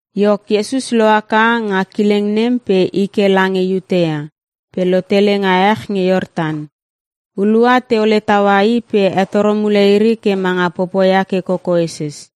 Iok, Iesus lohaka nga kileng nem pe i ke lange Iutea, pe lotele nga ech nge Iortan. Hulua teole taua i pe hetoro mule iri ke manga popoia ke kokoeses.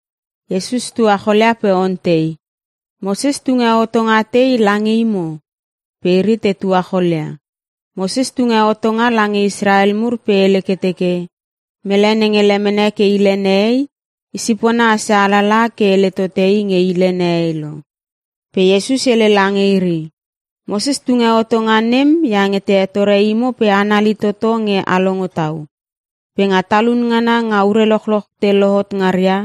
Iesus tuacholia pe ontei, “Moses tunge hotonga tei lange imo?” Pe iri te tuacholia. “Moses tunge hotonga lange Israel mur pe hele ke teke, ‘Mele nenge lemene ke hile nehei, isipona asia alalaha ke hele tote i nge hile nehei lo.’” Pe Iesus hele lange iri, “Moses tunge hotonga nem iange te hetore imo pe anali toto nge a longo tau. Pe nga talun ngana nga ure lochloch te lohot ngaria,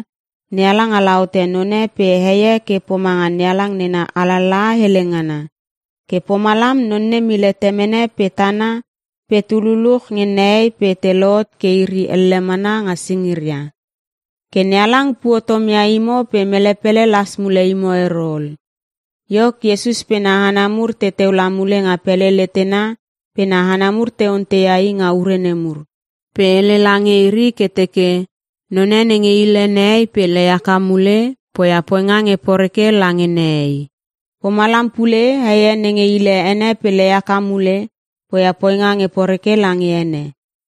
‘NeHalang ala hote none pe hei e ke pomanga NeHalang nena alalaha hele ngana.’ ‘Ke pomalam non nem hile temene pe tana pe tu luluch nge nehei pe te lohot ke iri elle mana nga singiria.’ Ke NeHalang puo tomia imo pe mele pele las mule imo ero ol.” Iok Iesus pe na hana mur teteu la mule nga pele letena pe na hana mur te onteia i nga ure nemur. Pe hele lange iri ke teke, “None nenge hile nehei pe lei haka mule, poia poinga nge poreke lange nehei. Pomalam pule, hei e nenge hile ene pe lei haka mule, poia poinga nge poreke lange ene.”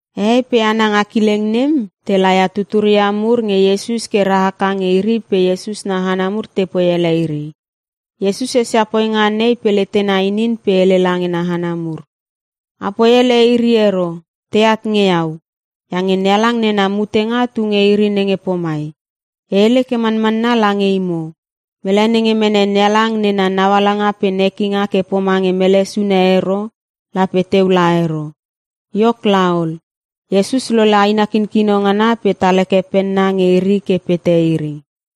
Hehei pe hana nga kileng nem, te laia tuturia mur nge Iesus ke rahaka nge iri pe Iesus na hana mur tepoi ele iri. Iesus esia poinga nei pe letena inin pe hele lange na hana mur, “Apoi ele iri ero, teat nge iau. Iange NeHalang nena mutenga tu nge iri nenge pomai. E hele ke manmanna lange imo, mele nenge mene NeHalang nena naualanga pe nekinga ke pomange mele sune ero, lape teu laia ero.” Iok laol, Iesus lole aina kinkino ngana pe tal heke penna nge iri ke pete iri.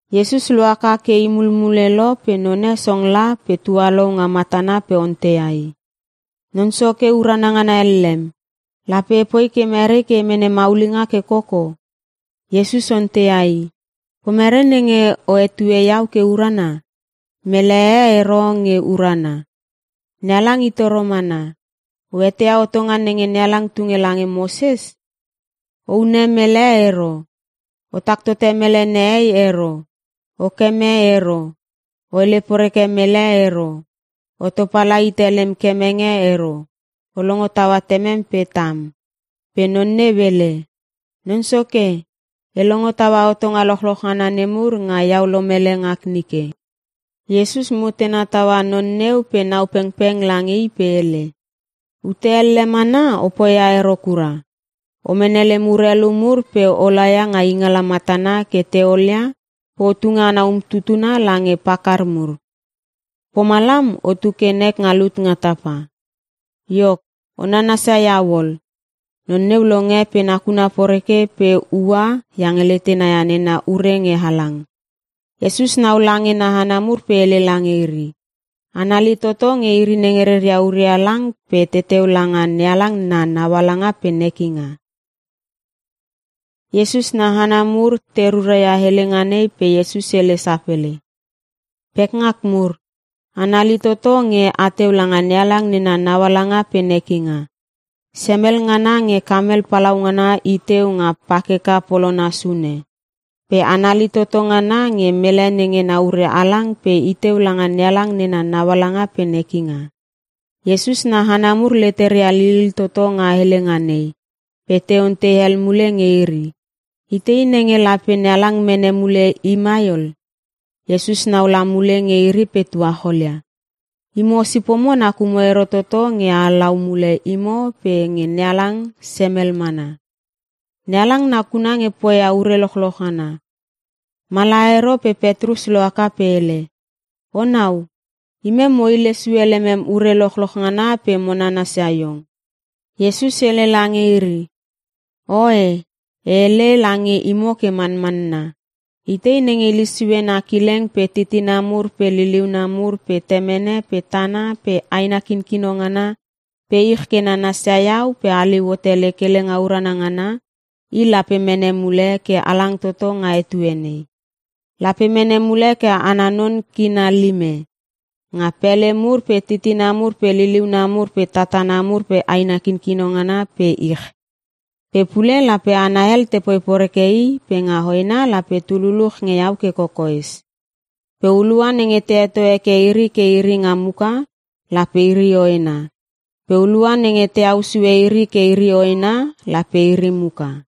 Iesus lohaka ke i mulmule lo pe none song la pe tualou nga matana pe onteia i, “Non Soke urana ngana ellem, lape epoi ke mere ke e mene maulinga ke koko?” Iesus onteia i, “Pomere nenge o hetue iau ke urana? Mele e ero nge urana. NeHalang i toro mana. O eteia hotonga nenge NeHalang tunge lange Moses. ‘O hune mele ero. O tak tote mele nehei ero. O keme ero. O hele poreke mele ero. O topala hite lem kemenge ero. O longo taua temem pe tam.’” Pe non neu hele, “Non Soke, e longo taua hotonga lochloch ngana nemur nga iau lolomele ngak nike.” Iesus mutena taua non neu pe nau pengpeng lange i pe hele, “Ute elle mana o poia ero kura. O mene lem urelu mur pe o laia nga ingala matana ke te olia pe o tunge ana umtutuna lange pakar mur. Pomalam otu ke nek nga lut nga tapa. Iok, o nanasia iau ol.” Non neu longe pe nakuna poreke pe ua iange letena ia nena ure nge halang. Iesus nau lange na hana mur pe hele lange iri, “Anali toto nge iri nenge reria urelu halang pe teteu langa NeHalang naualanga pe nekinga!” Iesus na hana mur te ruraia helenga nei pe Iesus hele sapele, “Pekngak mur, anali toto nge ateu langa NeHalang nena naualanga pe nekinga. Semel ngana nge kamel palaungana iteu nga pakeka polona sune. Pe anali toto ngana nge mele nenge na ure halang pe iteu langa NeHalang nena naualanga pe nekinga.” Iesus na hana mur leteria lilil toto nga helenga nei, pe te ontei hel mule nge iri, “Itei nenge lape NeHalang mene mule i mai ol?” Iesus nau la mule nge iri pe tuacholia, “Imo sipomo nakumo ero toto nge a halau mule imo pe nge NeHalang semel mana. NeHalang nakuna nge poia ure lochloch ngana.” Mala ero pe Petrus lohaka pe hele, “Onau, imem mo hile sue lemem urelu lochloch ngana pe mo nanasia iong.” Iesus hele lange iri, “Oe, e hele lange imo ke manmanna, itei nenge hile sue na kileng pe titina mur pe liliuna mur pe temene pe tana pe aina kinkino ngana pe ich ke nanasia iau pe haliu hote lek helenga urana ngana, i lape mene mule ke halang toto nga etue nei. Lape mene mule ke ana non kina lime; nga pele mur pe titina mur pe liliuna mur pe tatana mur pe aina kinkino ngana pe ich. Pe pule lape hana hel tepoi poreke i pe nga hoena lape tu luluch nge iau ke kokoes. Pe hulua nenge te heto heke iri ke iri nga muka, lape iri hoena. Pe hulua nenge te au sue iri ke iri hoena, lape iri muka.”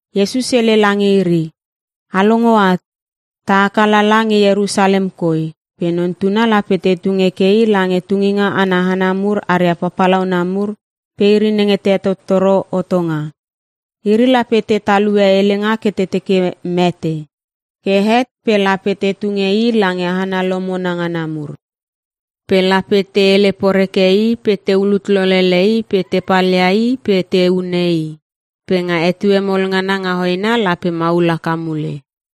Iesus hele lange iri, “A longo at. Ta haka lala nge Ierusalem koi pe Non Tuna lape te tung heke i lange tunginga ana hana mur aria papalauna mur pe iri nenge te hetottoro hotonga. Iri lape te talue helenga ke te teke mete. Ke het pe lape te tunge i lange hana lomona ngana mur. Pe lape te hele poreke i pe te ulut lolele i pe te palia i pe te hune i. Pe nga etue mol ngana nga hoena lape maul haka mule.”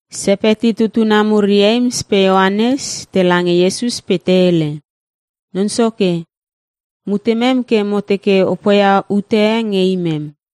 Sepeti tutuna mur Ieims pe Ioanes, tela nge Iesus pe te hele, “Non Soke, mutemem ke mo teke o poia ute nge imem.”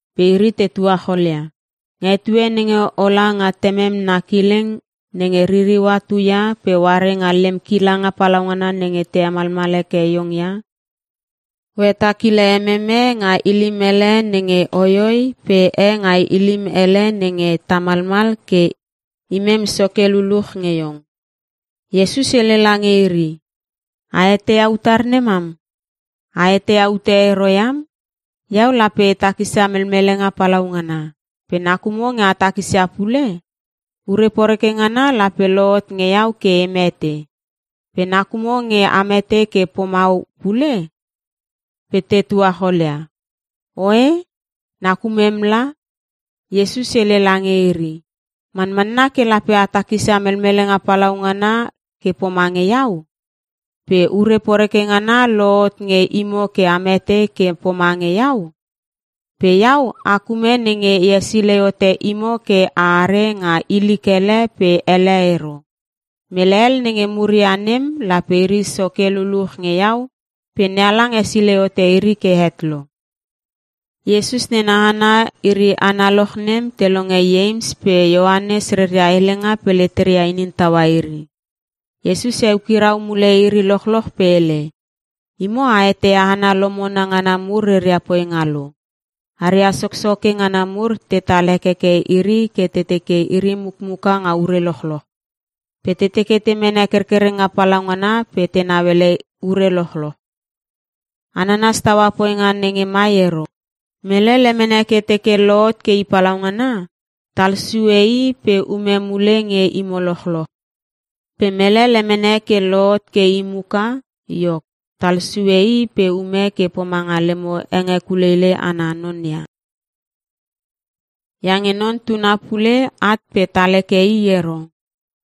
Pe iri te tuacholia, “Nga etue nenge ola nga temem na kileng nenge ririua tuia pe oare nga lem kilanga palaungana nenge te hemalmal heke iong ia, o hetakile emem e nga ilim hele nenge hoihoi pe e nga ilim hele nenge tamalmal ke imem soke luluch nge iong.” Iesus hele lange iri, “A eteia utar nemam? A eteia ute ero iam! Iau lape e takisia melmelenga palaungana. Pe nakumo nge a takisia pule? Ure poreke ngana lape lohot nge iau ke e mete. Pe nakumo nge a mete ke pomau pule?” Pe te tuacholia, “Oe, nakumem la.” Iesus hele lange iri, “Manmanna ke lape a takisia melmelenga palaungana ke pomange iau. Pe ure poreke ngana lohot nge imo ke a mete ke pomange iau. Pe iau ak ume nenge e hesilei hote imo ke a are nga ilik hele pe hele ero. Mele hel nenge muria nem lape iri soke luluch nge iau pe NeHalang hesilei hote iri ke het lo.” Iesus nena hana iri analoch nem te longe Ieims pe Ioanes reria helenga pe leteria inin taua iri. Iesus eukirau mule iri lochloch pe hele, “Imo a eteia hana lomona ngana mur reria poinga lo. Aria soksoke ngana mur tetal hekeke iri ke te teke iri mukmuka nga ure lochloch. Pe te teke te mene kerkerenga palaungana pe tenau ele ure lochloch. A nanas taua poinga nenge mai ero. Mele lemene ke teke lohot ke i palaungana, talsue i pe ume mule nge imo lochloch. Pe mele lemene ke i lohot ke i muka, iok, talsue i pe ume ke pomanga lemo hengekuleilei ana non ia. Iange Non Tuna pule at pe tal heke i ero.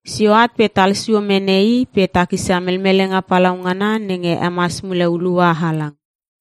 Sio at pe talsio mene i pe takisia melmelenga palaungana nenge hemas mule hulua halang.”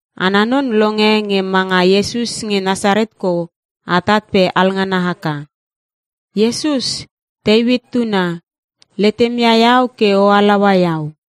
Ana non longe nge manga Iesus nge Nasaret kou atat pe alngana haka, “Iesus, Teuit tuna! Letemia iau ke o halaua iau!”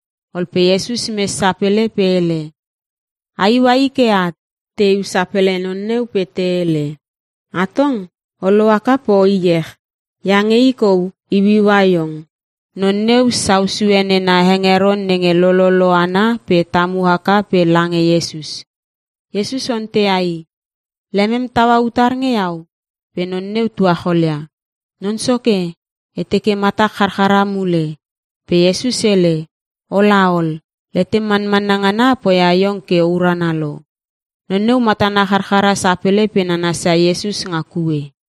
Ol pe Iesus mes sapele pe hele, “A iua i ke at.” Te iu sapele non neu pe te hele, “Atong o lohaka pe o iech, iange i kou iuiua iong.” Non neu sau sue nena hengeron nenge lololo ana pe tamu haka pe lange Iesus. Iesus onteia i, “Lemem taua utar nge iau?” Pe non neu tuacholia, “Non Soke, e teke matak charchara mule.” Pe Iesus hele, “Ola ol. Letem manmanna ngana poia iong ke o urana lo.” Non neu matana charchara sapele pe nanasia Iesus nga kue.